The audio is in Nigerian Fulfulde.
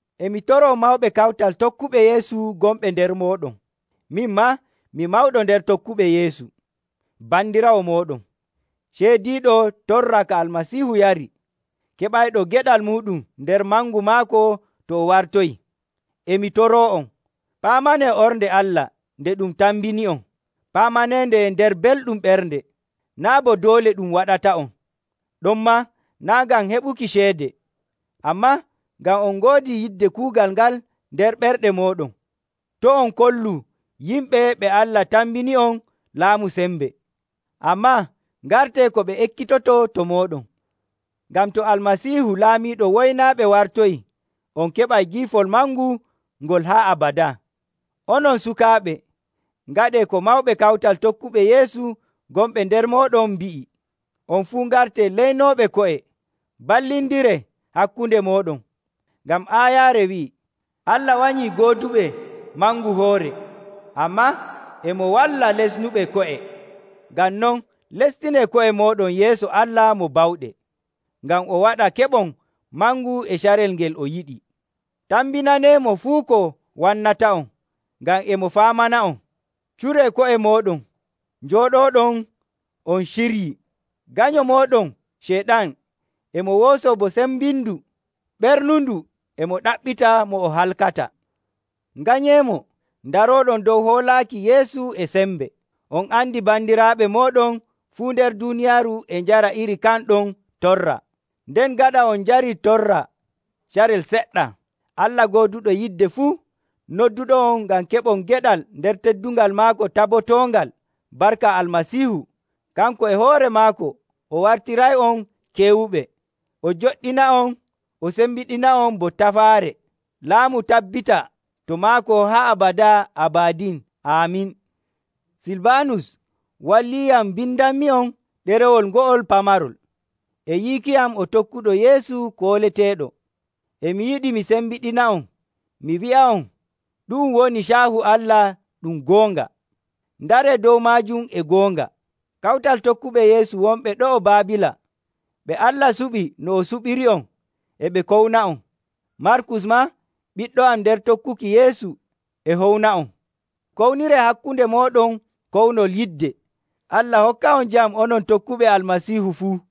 E mi toroo mawɓe kawtal tokkuɓe Yeesu gonɓe nder mooɗon. Min maa mi mawɗo nder tokkuɓe Yeesu, bandiraawo mooɗon, ceydiiɗo torra ka Almasiihu yari, keɓayɗo geɗal muuɗum nder mangu maako to o wartoyii. E mi toroo'on, paamanee ornde Allah nde ɗum tambini'on. Paamaneende nder belɗum ɓernde, naa' bo doole ɗum waɗata'on, ɗonmaa naa' ngam heɓuki ceede, ammaa ngam on ngoodi yidde kuugal ngal nder ɓerɗe mooɗon. To' on kollu yimɓe ɓe Allah tambini'on laamu sembe, ammaa ngartee ko ɓe ekkitotoo to mooɗon. Ngam to Almasiihu laamiiɗo woynaaɓe wartoyii, on keɓay giifol mangu ngol haa abadaa. Onon sukaaɓe, ngaɗee ko mawɓe kawtal tokkuɓe Yeesu gonɓe nder mooɗon mbi'i. On fuu ngartee leynooɓe ko'e, mballindiree hakkunde mooɗon. Ngam aayaare wi'ii, “Allah wanyii gooduɓe mangu hoore, ammaa e mo walla lesnuɓe ko'e.” Ngam non, lestinee ko'e mooɗon yeeso Allah mo bawɗe, ngam o waɗa keɓon mangu e carel ngel o yiɗi. Tambinaneemo fuu ko wannata'on, ngam e mo faamana'on. Curee ko'e mooɗon, njooɗooɗon on ciryii. Ganyo mooɗon Ceyɗan e mo woosoo bo sembindu ɓernundu e mo ɗaɓɓita mo o halkata. Nganyeemo, ndarooɗon dow hoolaaki Yeesu e sembe. On andi bandiraaɓe mooɗon fuu nder duuniyaaru e njara iri kan ɗon torra. Nden gaɗa on njarii torra carel seɗɗa, Allah gooduɗo yidde fuu, nodduɗo'on ngam keɓon geɗal nder teddungal maako tabotoongal barka Almasiihu, kanko e hoore maako o wartiray'on keewuɓe, o joɗɗina'on, o sembiɗina'on bo tafaare. Laamu tabbita to maako haa abadaa abadin. Aamin. Silbaanus walliyam mbindanmi'on ɗerewol ngo'ol pamarol. E yiiki am o tokkuɗo Yeesu kooleteeɗo. E mi yiɗi mi sembiɗina'on mi wi'a'on ɗu'um woni caahu Allah ɗum goonga. Ndaree dow maajum e goonga. Kawtal tokkuɓe Yeesu wonɓe ɗo'o Baabiila, ɓe Allah suɓi no o suɓiri'on, e ɓe kowna'on. Markus maa, ɓiɗɗo am nder tokkuki Yeesu, e howna'on. Kowniree hakkunde mooɗon kownol yidde. Allah hokka'on jam onon tokkuɓe Almasiihu fuu.